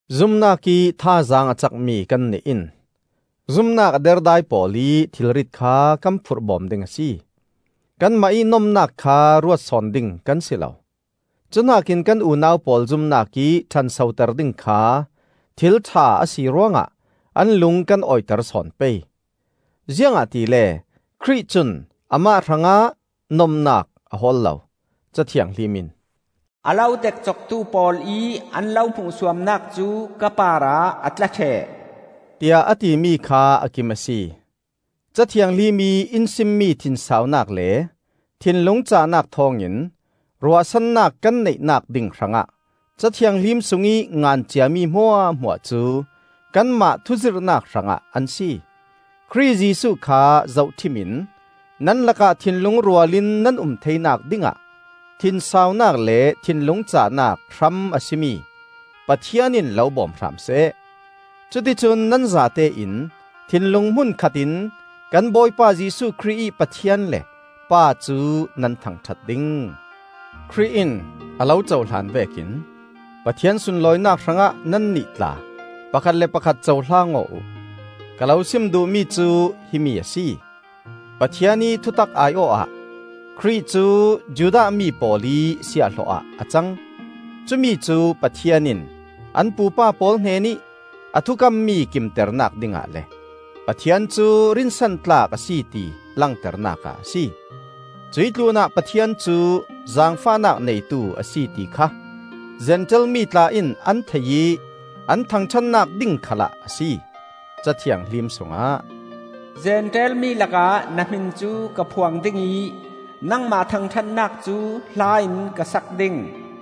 Zumnakih thazaang a cakmi kannih in zumnak a derdai pawl ih thilrit kha kan phurh bawm ding a si. Kanmah ih nomnak kha ruat sawn ding kan si lo. Cuhnakin kan unau pawl zumnak ih ṭhansoter ding kha thil ṭha a si ruangah an lung kan awiter sawn pei. Ziangahtile Khrih cun amah hrangah nomnak a hawl lo. Ca Thianghlim in, “A lo dekcoktu pawl ih an lo hmuhsuamnak cu ka parah a tla ṭheh,” tiah a timi kha a kim a si. Ca Thianghlim ih in simmi thinsaunak le thinlung cahnak thawngin ruahsannak kan neihnak ding hrangah Ca Thianghlim sungih ngan ciami hmuahhmuah cu kanmah thuzirhnak hrangah an si. Khrih Jesuh kha zohṭhim in nan lakah thinlung rual in nan um theinak dingah thinsaunak le thinlung cahnak hram a si mi Pathian in lo bawm hram seh. Cuti cun nan zatein thinlung hmunkhat in kan Bawipa Jesuh Khrih ih Pathian le Pa cu nan thangṭhat ding. Khrih in a lo cohlan vekin Pathian sunlawinak hrangah nannih tla pakhat le pakhat cohlang aw uh. Ka lo sim duhmi cu himi a si: Pathian ih thutak ai-awh ah Khrih cu Judah mi pawl ih siahhlawh ah a cang; cumi cu Pathian in an pupa pawl hnenih a thukammi kimternak dingah le Pathian cu rinsan tlak a si ti langternak ah a si. Cuih tlunah Pathian cu zaangfahnak neitu a si ti kha Zentail mi tla in an thei ih an thangṭhatnak ding khalah a si. Ca Thianghlim sungah: “Zentail mi lakah na hmin cu ka phuang ding ih, Nangmah thangṭhatnak cu hla in ka sak ding,”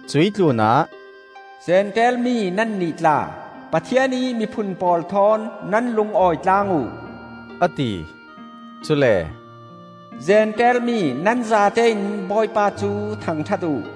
Cuih tlunah, “Zentail mi nannih tla, Pathian ih miphun pawl thawn nan lungawi tlang uh,” a ti. Cule, “Zentail mi nan zatein Bawipa cu thangṭhat uh;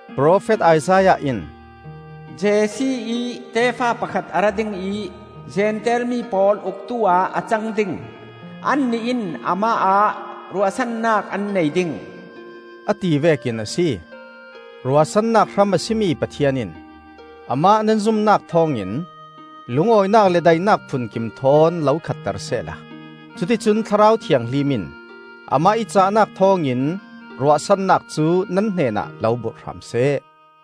Profet Isaiah in, “Jesse ih tefa pakhat a ra dingih Zentail mi pawl uktu-ah a cang ding; Annih in amah ah ruahsannak an nei ding,” a ti vekin a si. Ruahsannak hram a si mi Pathian in, amah nan zumnak thawngin, lungawinak le daihnak phunkim thawn lo khatter sehla, cuticun Thlarau Thianghlim in amah ih cahnak thawngin ruahsannak cu nan hnenah lo burh hram seh.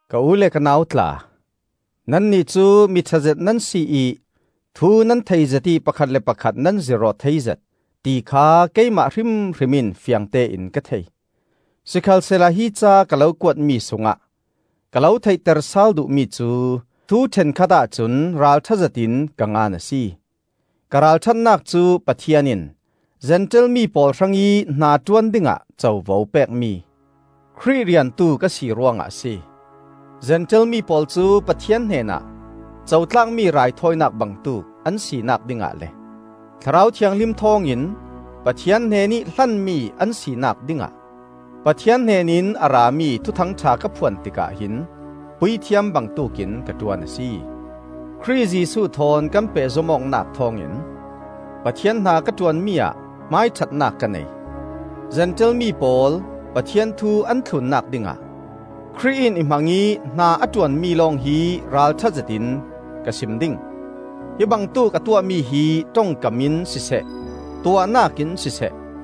Ka u le ka nau tla, nannih cu mi ṭhazet nan si ih thu nan theizet ih pakhat le pakhat nan zirh aw theizet, ti kha keimah hrimhrim in fiangtein ka thei. Sikhalsehla hi ca ka lo kuatmi sungah ka lo theihter sal duh mi cu thu ṭhenkhat ahcun ralṭhazetin ka ngan a si. Ka ralṭhatnak cu Pathian in Zentail mi pawl hrangih hnaṭuan dingah covo pekmi, Khrih riantu ka si ruangah a si. Zentail mi pawl cu Pathian hnenah cotlakmi raithawinak bangtuk an sinak dingah le Thlarau Thianghlim thawngin Pathian hnenih hlanmi an sinak dingah Pathian hnen in a rami Thuthangṭha ka phuan tikah hin puithiam bangtuk in ka ṭuan a si. Khrih Jesuh thawn kan pehzom awknak thawngin Pathian hna ka ṭuanmi ah hmaiṭhatnak ka nei. Zentail mi pawl Pathian thu an thlunnak dingah Khrih in i hmang ih hna a ṭuanmi lawng hi ralṭhazetin ka sim ding. Hi bangtuk a tuahmi hi ṭongkam in siseh tuahnak in siseh,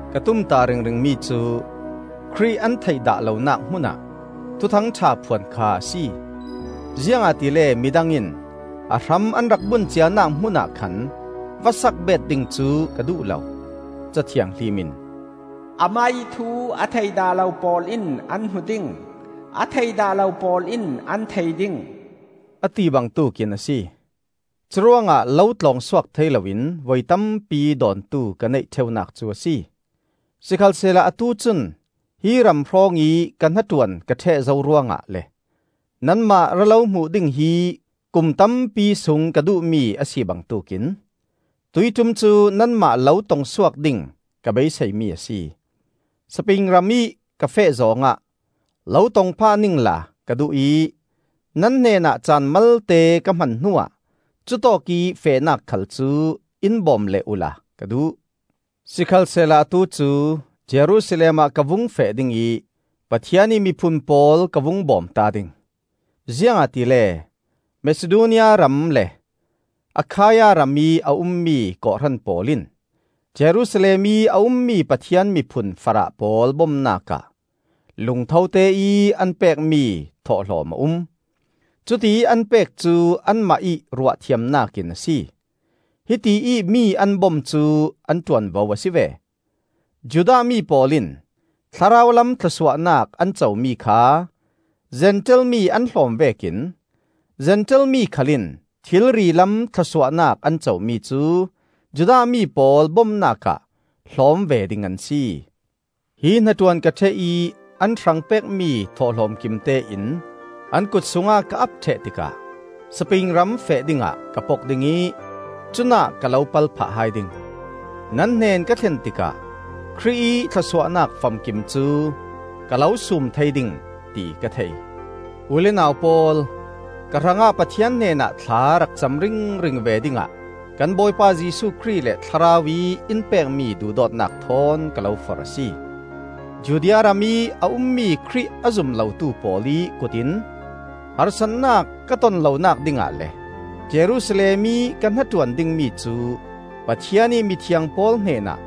Ka tumtah ringringmi cu Khrih an theih dah lonak hmunah Thuthangṭha phuan kha a si, ziangahtile midang in a hram an rak bun cianak hmunah khan va sak beet ding cu ka duh lo. Ca Thianghlim in, “Amah ih thu a thei dah lo pawl in an hmu ding, A thei dah lo pawl in an thei ding,” a ti bangtuk in a si. Curuangah lo tlawng suak thei loin voi tampi dawntu ka neih ṭheunak cu a si. Sikhalsehla atu cun hi ram hrawngih ka hnaṭuan ka ṭheh zo ruangah le nanmah ra lo hmuh ding hi kum tampi sung ka duhmi a si bangtuk in, tuihṭum cu nanmah lo tongsuak ding ka beiseimi a si. Spain ramih ka feh zawng ah lo tong phah ningla ka duh ih nan hnenah caan malte ka hman hnuah cutawkih fehnak khal cu in bawm leh uhla ka duh. Sikhalsehla atu cu Jerusalem ah ka vung feh ding ih Pathian ih miphun pawl ka vung bawmta ding. Ziangahtile Masidonia ram le Akhaia ramih a ummi kawhhran pawl in Jerusalem ih a ummi Pathian miphun farah pawl bomnak ah lungthote ih an pekmi thawhlawm a um. Cutiih an pek cu anmah ih ruahthiamnak in a si; hiti ih mi an bom cu an ṭuanvo a si ve. Judah mi pawl in thlarau lam thlawsuahnak an comi kha Zentail mi an hlawm vekin Zentail mi khal in thilri lam thlawsuahnak an comi cu Judah mi pawl bomnak ah hlawm ve ding an si. Hi hnaṭuan ka ṭheh ih an hrang pekmi thawhlawm kimtein an kutsungah ka ap ṭheh tikah Spain ram feh dingah ka pok ding ih cunah ka lo pal phah hai ding. Nan hnen ka thlen tikah Khrih ih thlawsuahnak famkim cu ka lo sum thei ding, ti ka thei. U le nau pawl, ka hrangah Pathian hnenah thla rak cam ringring ve dingah kan Bawipa Jesuh Khrih le Thlarau ih in pekmi duhdawtnak thawn ka lo forh a si. Judea ramih a ummi Khrih a zum lotu pawl ih kut in harsatnak ka tonlonak dingah le Jerusalem ih ka hnaṭuan dingmi cu Pathian ih mithiang pawl hnenah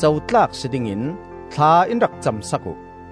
cotlak si dingin thla in rak cam sak uh.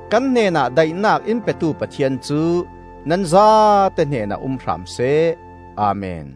Kan hnenah daihnak in petu Pathian cu nan zate hnenah um hram seh. Amen.